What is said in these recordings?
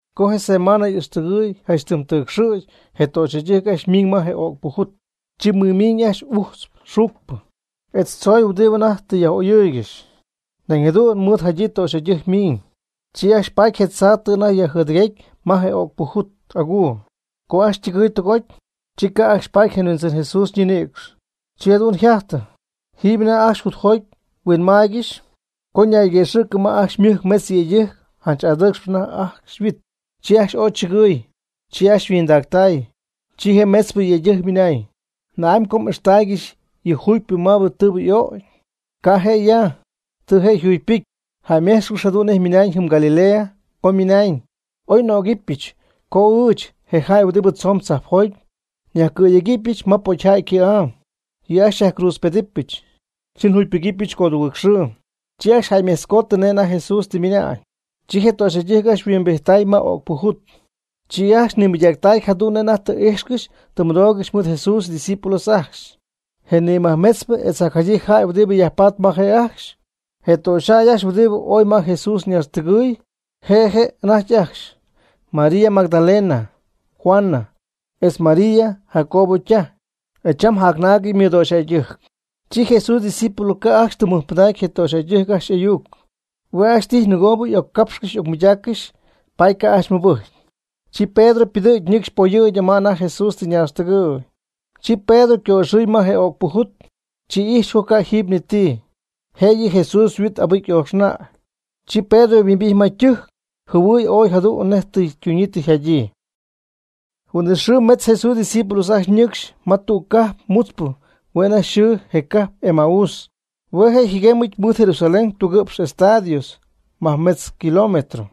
Co je semaan y'ixtɨgɨɨy janch tɨm tɨcxɨ̈cp je töxyjäydɨjc ajcxy ymiiñ ma je o'cpɨ jut, chi mɨmiiñ ajcxy ujtz xuucpɨ, etz tzoy huɨdibɨ anajty tɨ yaj'oyɨɨygɨxy. Nañ jadu'n mɨɨdjadyii töxyjäydɨjc miiñ. Chi ajcxy paty je tzaa tɨ anajty yjɨdɨguegyii ma je o'cpɨ jut'aguu. Co ajcxy ytɨgɨɨy jutjoty, chi ca' ajcxy paty je Huindzɨn Jesús ñinïcx. Chi jadu'n yjajty, jiiby anajty ajcxy jutjoty huinmaaygɨxy, co ñayguëxɨ̈gɨ ma ajcxy ymɨjc metz yëydɨjc janch adɨcxp anajty yhuit. Chi ajcxy ooy chɨgɨy, chi ajcxy yhuindactay, chi je metzpɨ yëydɨjc ymɨnañ: ―¿Na'amy co m'ixtaaygɨxy yɨ jugypɨ ma yɨ tɨɨbɨ y'ögy? Ca' je' ya, tɨ je' yjugypɨcy. Jäyméjtzcɨx jadu'n nej mɨna'ñ jɨm Galilea, co ymɨnañ: ―Ooy ycopɨ́cyɨty co ɨɨch, je jäy huɨdi tzoon tzajpjoty, nyajcɨ̈yegɨpy pocyjäy cɨ̈'am. Yɨ' ajcxy xyajcruudzpedɨpyɨch, chi njugypɨgɨpyɨch codugɨɨg xɨɨ. Chi ajcxy oy jäymejtzcooty nej anajty Jesús tɨ ymɨna'ñ. Chi je töxyjäydɨjc ajcxy yhuimbijttay ma o'cpɨ jut. Chi ajcxy yajmɨɨdmɨydactay jadu'n nej anajty tɨ íjxcɨxy tɨ mɨdoogɨxy mɨɨd Jesús ydiscípulos ajcxy je nimajmetzpɨ etz jacjadyii jäy huɨdi yajpaatp ma je' ajcxy. Je töxyjäy ajcxy huɨdi ooy ma Jesús ñaaxtɨgɨɨy, je' je' anajty ajcxy: María Magdalena, Juana, etz María Jacobo ytaj, e cham jacnaagɨty ymɨdöxyjäydɨjc. Chi Jesús ydiscípulos ca' ajcxy tɨm mɨjpɨdacy je töxyjäydɨjc ajcxy ayuc, hue' ajcxy tijy nɨgo y'occapxcɨxy y'ocmɨydaaccɨx, paady ca' ajcxy mɨbɨjcy. Chi Pedro ypɨdɨ̈gy ñɨcxy poyɨ̈gyɨ ma anajty Jesús tɨ ñaaxtɨgɨ̈y. Chi Pedro yco'ixɨɨy ma je o'cpɨ jut, chi ijxy co ca' jiiby ni ti, jëyɨ Jesús yhuit abɨcy y'ooxnäy. Chi Pedro yhuimbijty ma ytɨjc jɨhuɨɨy ooy jadu'n nej tɨ ytuñyii yjadyii. Huin'it xɨɨ metz Jesús ydiscípulos ajcxy ñɨcxy ma tüg cajp mutzpɨ hue' anajty yxɨɨ je cajp Emaús, hue' yjɨguemyɨty mɨɨd Jerusalén tugɨ'px estadios (majmetz kilómetro).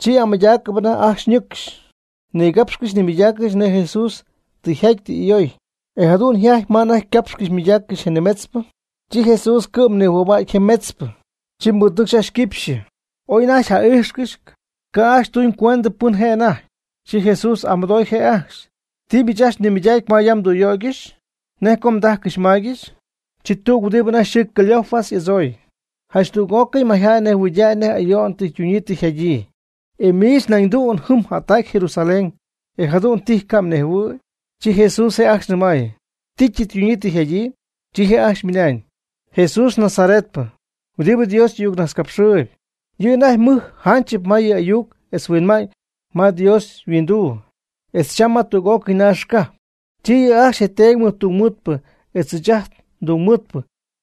Chi amɨydaacɨp anajty ajcxy ñɨcxy. Nigapxcɨxy nimɨydaaccɨxy nej Jesús tɨ yjaty tɨ y'ayoy. E jadu'n yjaty ma anajty ycapxcɨxy ymɨydaaccɨxy je nimetzpɨ, chi Jesús cɨ'm nimɨjhua'cy je metzpɨ, chi mɨɨd ñɨcxy ajcxy yquipxyɨ. Oy anajty ja'ijxcɨxy, ca' ajcxy tuñcuend pɨn je' anajty. Chi Jesús y'amɨdooy je' ajcxy: ―¿Ti miich ajcxy mɨydacpy ma yam mdüyöygɨxy? ¿Nej co mdájcɨxy mmáygɨxy? Chi tüg huɨdi anajty yxɨɨ Cleofas y'adzooy: ―Janch tüg'ócɨy mayjäy nejhuɨydäy je ayo'n tɨ ytunyii tɨ yjadyii. ¿E miich naydüg jɨm jättac Jerusalén, e jadu'n tijy ca' mnejhuɨ̈y? Chi Jesús je' ajcxy nɨmay: ―¿Ti tɨ ytuñyii tɨ yjadyii? Chi je' ajcxy ymɨnañ: ―Jesús Nazaretpɨ, huɨdi Dios y'ayucnajtzcapxɨɨyɨp, yɨ' anajty mɨj jánchɨp ma yɨ ayuc etz huinma'ñ ma Dios yhuinduu, etz cham ma tüg'ócɨy naax cajp. Chi yɨ' ajcxy je teedy mɨjtungmɨɨdpɨ etz ɨɨch ajt ndungmɨɨdpɨ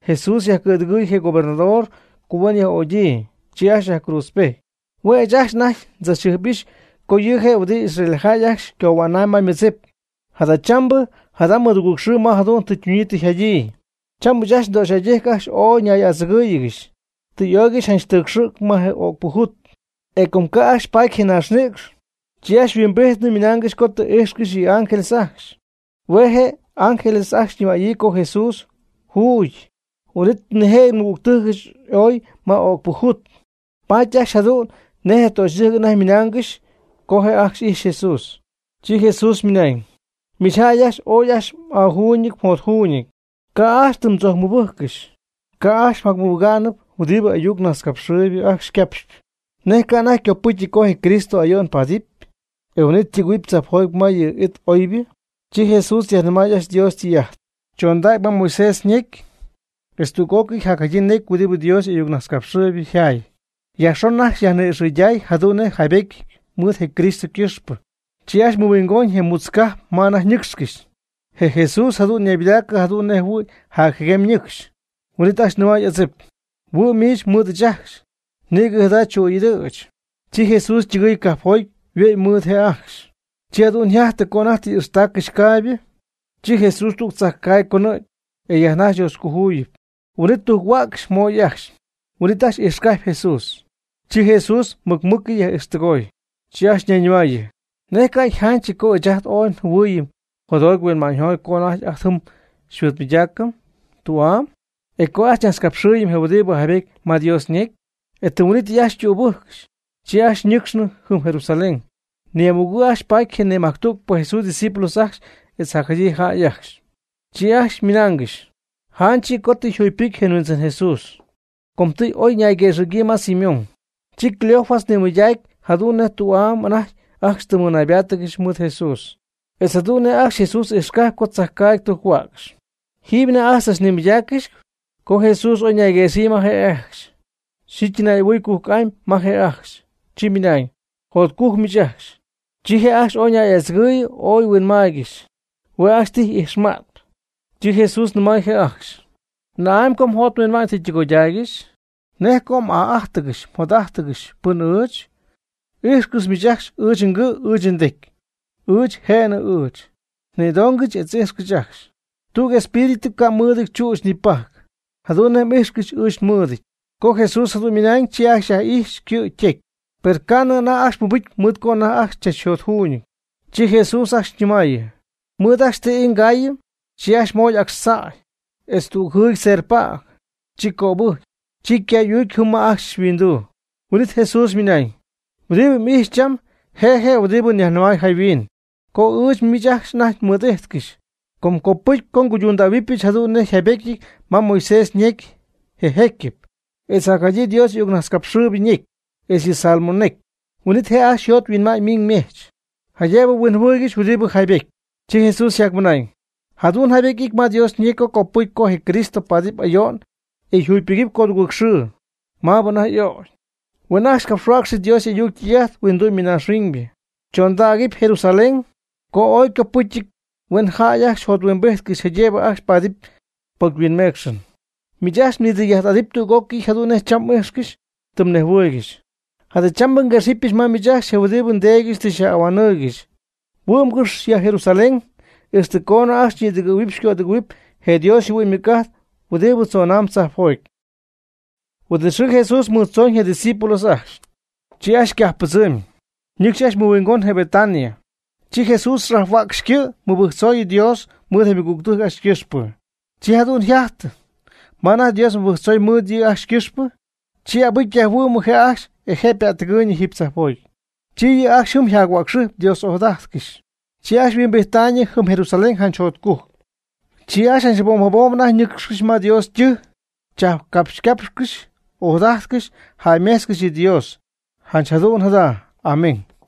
Jesús yajcɨ̈dɨgɨɨy je gobernador co huen yaj'ögyii. Chi ajcxy yajcruudzpejty. Hue' ɨɨch ajcxy anajty ndzach'ahuijxyp co yɨ' je' huɨdi Israeljäy ajcxy cohuänaam ma ymɨdzip. Jadachambɨ jada' ymɨdugɨɨgxɨɨ ma jadu'n tɨ ytunyii tɨ yjadyii. Cham ɨɨch ajcxy ndöxyjäydɨjc ajcxy ooy xy'adzɨgɨ́ɨygɨxyɨch. Tɨ y'oygɨxy janch tɨcxɨ̈cp ma o'cpɨ jut. E com ca' ajcxy paaty je ñaaxnïcx, chi ajcxy yhuimbijtnɨ ymɨnaangɨxy co tɨ íjxcɨxy yɨ ángeles ajcxy, hue' je ángeles ajcxy ymɨnañ co Jesús yjuugyɨty. Huin'it nijëjɨty nmɨgügtɨjcɨch ooy ma o'cpɨ jut, paty ajcxy janch jadu'n nej töxyjäydɨjc anajty ymɨnaangɨxy. Ca' je' ajcxy ijxy Jesús. Chi Jesús ymɨnañ: ―¡Miich jäy ajcxy ooy ajcxy m'aajuuñɨty mjotjuuñɨty, ca' ajcxy tɨ mdzojcmɨbɨjccɨxy co ajcxy mjamɨbɨgá'nɨp huɨdibɨ y'ayuc najtzcapxɨɨybɨ ajcxy ycapxy! ¿Nej ca' anajty ycopɨ́cyɨty co je Cristo ayo'n paadɨp, e huin'it ytɨgɨ̈huɨp tzajpjoty ma yɨ' y'it oybɨ? Chi Jesús yajnɨmaay ajcxy Dios ytɨy'ajt, chondägy ma Moisés ñecy, etz tüg'ócɨy jacjadyii necy huɨdi Dios y'ayucnajtzcapxɨɨybɨ yjaay, yajxon ajcxy yajni'ixɨyday jadu'n nej yjaybétyɨty mɨɨd je Cristo ycɨxpɨ. Chi ajcxy mɨhuingoñ je mutz cajp ma anajty ñɨ́cxcɨxy, je Jesús jadu'n ñaybɨdaacɨ jadu'n nej jɨhuɨ̈y jacjɨguem ñɨcxy. Huin'it ajcxy nɨmay adzip: ―Huɨ'm miich mɨɨd ɨɨch ajcxy, nïgɨ jada chuu'ɨɨy'adɨ̈ch. Chi Jesús ytɨgɨɨy cajpjoty yhuɨ'my mɨɨd je' ajcxy. Chi jadu'n yjajty co anajty tɨ y'ixtaaccɨxy caaybɨ, chi Jesús tüg tzajcaagy conɨ̈gy, e yajnajxy Dios cojuyip, huin'it tujc-huäcxy moy ajcxy. Huin'it ajcxy ijxcajpy Jesús. Chi Jesús mɨc mɨ́cɨy yaj'ijxtɨgoy. Chi ajcxy ñayñɨmaayɨ: ―¿Nej ca' yjánchɨty co ɨɨch ajt ooy njɨhuɨɨyɨm jotjoty huinma'ñjoty co anajty ajt jɨm xymɨɨdmɨydacɨm tü'am, etz co ajt xyñajtzcapxɨɨyɨm je huidi jaybety ma Dios ñecy? E tɨm huin'ítɨy ajcxy tübɨ́jccɨxy, chi ajcxy nɨ́cxcɨxnɨ jɨm Jerusalén. Ni'amugɨ' ajcxy paty je majctügpɨ Jesús ydiscípulos ajcxy e jacjadyii jäy ajcxy. Chi ajcxy mɨnaangɨxy: ―Janch yɨ' co tɨ yjugypɨcy je Huindzɨn Jesús, com tɨ oy ñayguëxɨ̈gyii ma Simón. Chi Cleofas nimɨydacy jadu'n nej tü'ay anajty ajcxy tɨ ñaybáatɨgɨxy mɨɨd Jesús, etz jadu'n nej ajcxy Jesús ijxcajpy co tzajcaagy tɨ tujc-huäcxy. Jiiby anajty ajcxy tzachnimɨydaaccɨxy co Jesús oy ñayguëxɨ̈gyii ma je' ajcxy. Chi ytɨnay'ahuɨɨy cujc'amy ma je' ajcxy, chi ymɨnañ: ―Jotcugɨ' miich ajcxy. Chi je' ajcxy ooy ñay'adzɨgɨyɨ ooy huinmaaygɨxy, hue' ajcxy tijy ijxmañɨɨyb. Chi Jesús nɨmay je' ajcxy: ―¿Na'amy co mjot mhuinma'ñ tɨ ytɨgoydaaygɨxy? ¿Nej co m'aa'ájtɨgɨxy mjot'ájtɨgɨxy pɨn ɨɨch? Ijxcɨx miich ajcxy ɨɨch ngɨ' ɨɨch ndecy, ɨɨch jënɨ ɨɨch. Nïdongɨch etz íjxcɨch ajcxy. Tüg espíritu ca' mɨɨdɨty chüch ni ypajc, jadu'n nej m'ijxcɨxy ɨɨch nmɨɨdɨty. Co Jesús jadu'n ymɨnañ, chi ajcxy yaj'ijxy ycɨ' ytecy. Per ca'nɨ ajcxy mɨbɨjcy mɨɨd co anajty ajcxy chachjotcújcɨty, chi Jesús ajcxy nɨmaayɨ: ―¿Mɨɨd ajcxy ti ii mgayɨpy? Chi ajcxy moy Jesús acxtzäy, etz tüg jɨɨdy serpäg. Chi cöbɨjcy, chi ycaay y'uucy jɨm ma je' ajcxy yhuinduu. Huin'it Jesús ymɨnañ: ―Huɨdi m'ijxyp cham je' je' huɨdi nyajnɨmay jayhuin, co ɨɨch miich ajcxy anajty mɨɨd'ijtcɨxy, co copɨcy nguydundähuɨbɨch jadu'n nej yjaybétyɨty ma je Moisés ñecy je jëcyɨp, etz jacjadyii Dios y'ayucnajtzcapxɨɨybɨ ñecy, etz yɨ salmo necy. Huin'it je' ajcxy yjot yhuinma'ñ ymiiñ ymejch, jaydëbɨ huinjɨhuɨ́ɨygɨxɨpy huɨdi jaybétyɨp. Chi Jesús yjacmɨnañ: ―Jadu'n jaybety y'ity ma Dios ñecy co copɨcy co je Cristo paadɨp ayo'n e yjugypɨgɨpy codugɨɨg xɨɨ, maabɨ anajty y'ögy. Huen ajcxy yajcapxhuäcxy Dios ytɨy'ajt huindu'my naaxhuiñ, chondägɨp Jerusalén, co ooy ycopɨ́cyɨty huen jäy ajcxy jothuimbijtcɨx jaydëbɨ ajcxy paadɨp pocyhuinmeecxɨn. Miich ajcxy nidɨy'ajt'adɨpy tüg'ócɨy jadu'n nej cham tɨ m'ijxcɨxy tɨ mnejhuɨɨygɨxy. Jadachambɨ nguexɨpyɨch ma miich ajcxy je huɨdi nDeedyɨch tɨ xyaj'ahuanɨɨygɨxy. Huɨ'mgɨx ya Jerusalén ixtɨ coonɨ ajcxy xyñïdɨgɨ̈huɨp xycödɨgɨ̈huɨp je Dios yjɨhuɨ'ñ ymɨc'ajt huɨdi tzonam tzajpjoty. Huin'it xɨɨ Jesús mɨɨd tzoñ je' ydiscípulos ajcxy, chi ajcxy ycajppɨdzɨmy, ñɨcxy ajcxy mɨhuingon je Betania. Chi Jesús xajhuäcxy ycɨ' mɨbɨjctzoy Dios mɨɨd je ymɨgügtɨjc ajcxy ycɨxpɨ. Chi jadu'n yjajty ma anajty Dios mɨbɨjctzoy mɨɨd yɨ' ajcxy ycɨxpɨ, chi abɨcy yajhuɨ'mnɨ je' ajcxy e je' ypättɨgɨɨyñɨ jiiby tzajpjoty. Chi yɨ' ajcxy jɨm yjac-huäcxɨjpy Dios ojadajtcɨxy. Chi ajcxy yhuimbijttaayñɨ jɨm Jerusalén janch jotcujc. Chi ajcxy jabom jabom anajty ñɨcxcɨxy ma Dios ytɨjc chajpcapxycapxcɨxy, ojadajtcɨxy jäymejtzcɨxy yɨ Dios, Janch jadu'n jada. Amén.